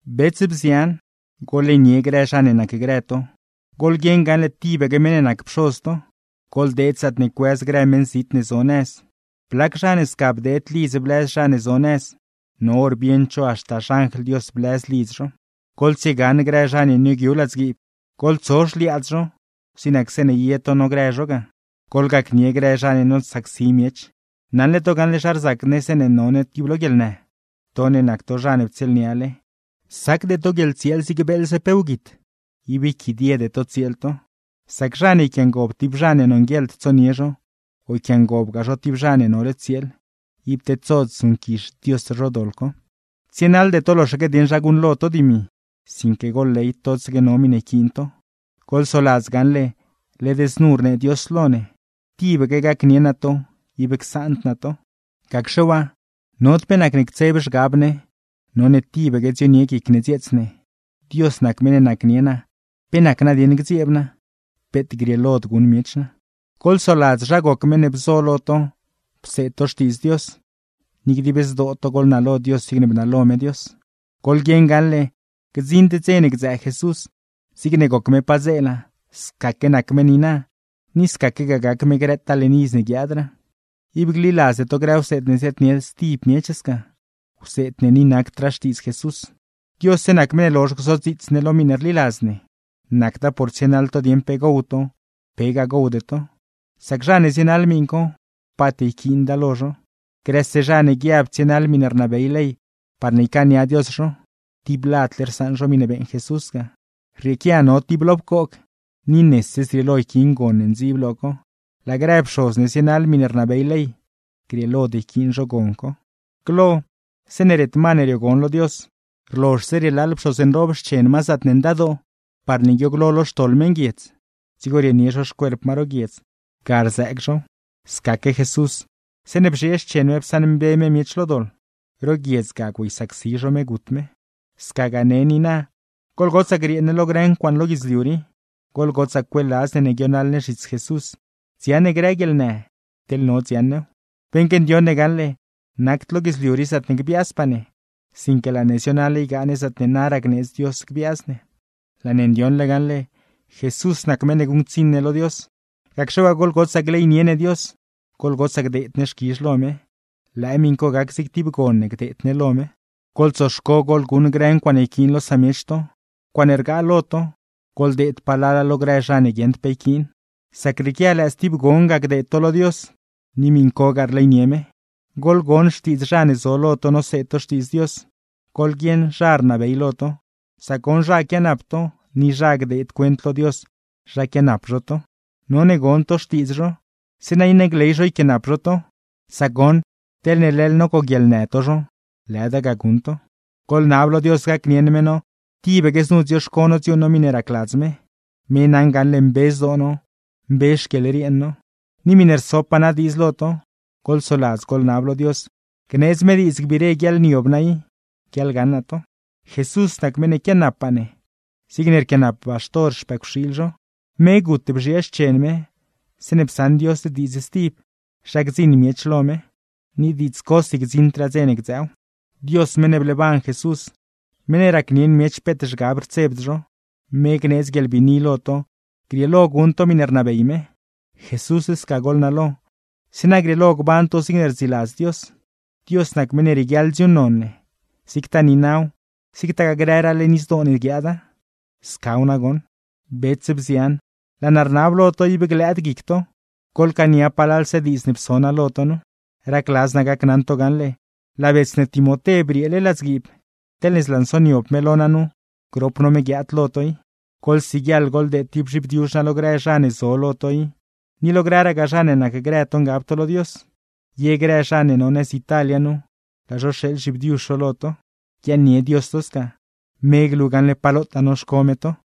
Bets, bzian, goḻleynie grë zha ne nacgrë to, goḻguieṉ gaṉle tibaque meṉ ne nac Pxoz to. Goḻdeed zaatne cuëz grë meṉzit ne zo nëz. Blac zha ne sca bdeed lidz blëz zha ne zo nëz, no hor bieṉd zho haxta xanjl Dios blëz lidz zho. Goḻtsiegaṉ grë zha ne nioogyu ladzguiib, goḻtso xliaadz zho zig nac zeeṉe ye to nogrë zho ga. Goḻgacnie grë zha ne nosacsi miech, naṉle to gaṉle zha rzac ne zeeṉe no ne tib lo guieḻnë. To ne nac to zha ne ptsieelniale, sacde to guieḻtsieel zig beeḻze pe wguit, ib yquidiede to tsieel to; sac zha ne yquiangob tib zha ne nonguieḻd tsonie zho o yquiangobgaa zho tib zha ne nole tsieel, ib tedsod zuṉquizh Dios zho doḻ co. Tsienaḻde to loxaque dieṉ zha guṉlo to dimi; sinque goḻley totsaque no miṉe yquiin to. Goḻsoladz gaṉle, led znu rnee Dios lo ne: “Tibaque gacnie naa to, ib csaand naa to.” Gacxe waa, nod pe nacne ctseb zhgab ne, none tibaque dzionie guic ne dzieets ne: Dios nac meṉ ne nacnie naa, ¿pe nac nadieṉ gdzieeb naa? ¡Peet grieelod guṉ miech naa! Goḻsoladz zha goc meṉ ne bzo lo to pseed to Xtiidz Dios, ni dib zdoo to goḻnalo Dios zigne bnalo me Dios. Goḻguieṉ gaṉle, gdziṉd dze ne gdzëë Jesús, zigne goc me padzeela, scaque nac me niina, ni scaquegaa gac me grëtaa leṉ iz ne guiaadraa. Ib gliladzde to grë wseed ne ziaadnie stib miech sca, wseed ne ni nacdraa Xtiidz Jesús. Diosse nac meṉ ne lozh gzodziits ne lo miṉe rliladz ne; nacda por tsienaḻ to dieṉ pe gow to, pegaa gowde to; sac zha ne zienaḻ miṉ co, paat yquiinda lo zho. Grëse zha ne guiab tsienaḻ miṉe rnabey ley parne ycaania Dios zho, tib ladle rsaṉ zho miṉe beeṉ Jesús ga. Rrieequia no tib lo pcoog, ni nese zrieelo yquiin gon ne ndziib lo co; laa grë pxoz ne zienaḻ miṉe rnabey ley, grieelod yquiin zho gon co. Glo, zeeṉe ret ma ne riogon lo Dios, rlozhse rielaaḻ pxoz nroob xchen ma zaatne Ndadoo parne guiooglo lo xtoḻ meṉguiedz, dzigo rienie zho xcuerp ma ro guiedz, ga rzëëg zhow. Scaque Jesús, zeeṉe bzhiee xchen me psaṉmbe me miech lo doḻ; ro guiedz ga güeysacsi zho me gut me. Scagaa ne niina, goḻgotsaa griee ne lo grë ncuaaṉe lo guidzliu rii, goḻgotsaa cueeladz ne ne guionaḻ ne zhits Jesús dziaṉ ne grë guieḻnë, teḻne no dziaṉ new. Beṉque ndioṉ ne gaṉle, nacd lo guidzliu rii zaatne gbiaazpaa ne, sinque laa ne zionaḻ ygaa ne zaatne naraa gneedz Dios gbiaaz ne. Laa ne ndioṉle gaṉle, Jesús nac meṉ ne guṉctsiṉ ne lo Dios; gacxe waa, goḻgotsaa gleynie ne Dios, goḻgotsaa gdeed ne xquizh lo me. Lëë miṉ co gac zig tib gon ne gdeed ne lo me. Goḻtsoxco goḻguṉ grë ncuaaṉe yquiin lo samiech to, ncuaaṉe rgaa lo to, goḻdeed palala lo grë zha ne guieṉd pe yquiin; sac rrieequia lëë stib gon ga gdeed to lo Dios, ni miṉcogaa rleynie me. Goḻgon xtiidz zha ne zo lo to noseed to Xtiidz Dios, goḻguieṉ zha rnabey lo to, sac goṉ zha quianap to ni zha gdeed cuent lo Dios zha pquianap zho to. None gon to xtiidz zho, zeeṉa iṉe gley zho yquiaanap zho to; sac goṉ, teḻne leḻ nogoguieḻnë to zho, lëda ga guṉ to. Goḻnab lo Dios gacnieṉ me no tibaque znu dzioxco no dziuuṉ no miṉe racladz me, me naṉ gaṉle mbe zdoo no, mbe xquieḻrien no. Ni miṉe rsopaa naa diidz lo to, goḻsoladz goḻnab lo Dios gneedz me diidz gbiire guiaḻniob naa i, guiaḻgaṉ naa to. Jesús nac meṉ ne quianappaa ne, zig rquianap baxtor xpëcwxiil zho; me gut bzhiee xchen me zeeṉe psaṉ Dios diidz stib zha gdziṉ miech lo me; ni diidz cosi gdziṉdraa dze ne gdzëëw. Dios meṉ ne bleeban Jesús, meṉ ne racnieṉ miech peet zhgab rtsebd zho, me gneedz guieḻbiini lo to grieelo to guṉ to miṉe rnabey me. Jesús sca goḻnalo, zeeṉa grieelo gban to zigne rdziladz Dios. Dios nac meṉ ne rieguiaḻ dziuuṉnon ne, zigtaa niinaw, zigtagaa grëraa leṉ izdoo ne guiaada. Scaw nagoṉ. Bets, bzian, laa naa rnab lo to ib glëëd guic to, goḻcaania palalse diidz ne pso naa lo to nu. Racladz naa gacnaṉ to gaṉle, laa bets ne Timoté brieele ladzguiib; teḻne zlansoniob me lo naa nu, grop no me guiaad lo to i. Goḻsiguieḻ goḻdeed tib zhibdiuzh naa lo grë zha ne zo lo to i, ni lo grëragaa zha ne nacgrë to ngab to lo Dios. Ye grë zha ne no nëz Italia nu, laa zho rxeeḻ zhibdiuzh zho lo to. Guiaaṉnie Dios to sca. Me glu gaṉle pa lotaa noxco me to.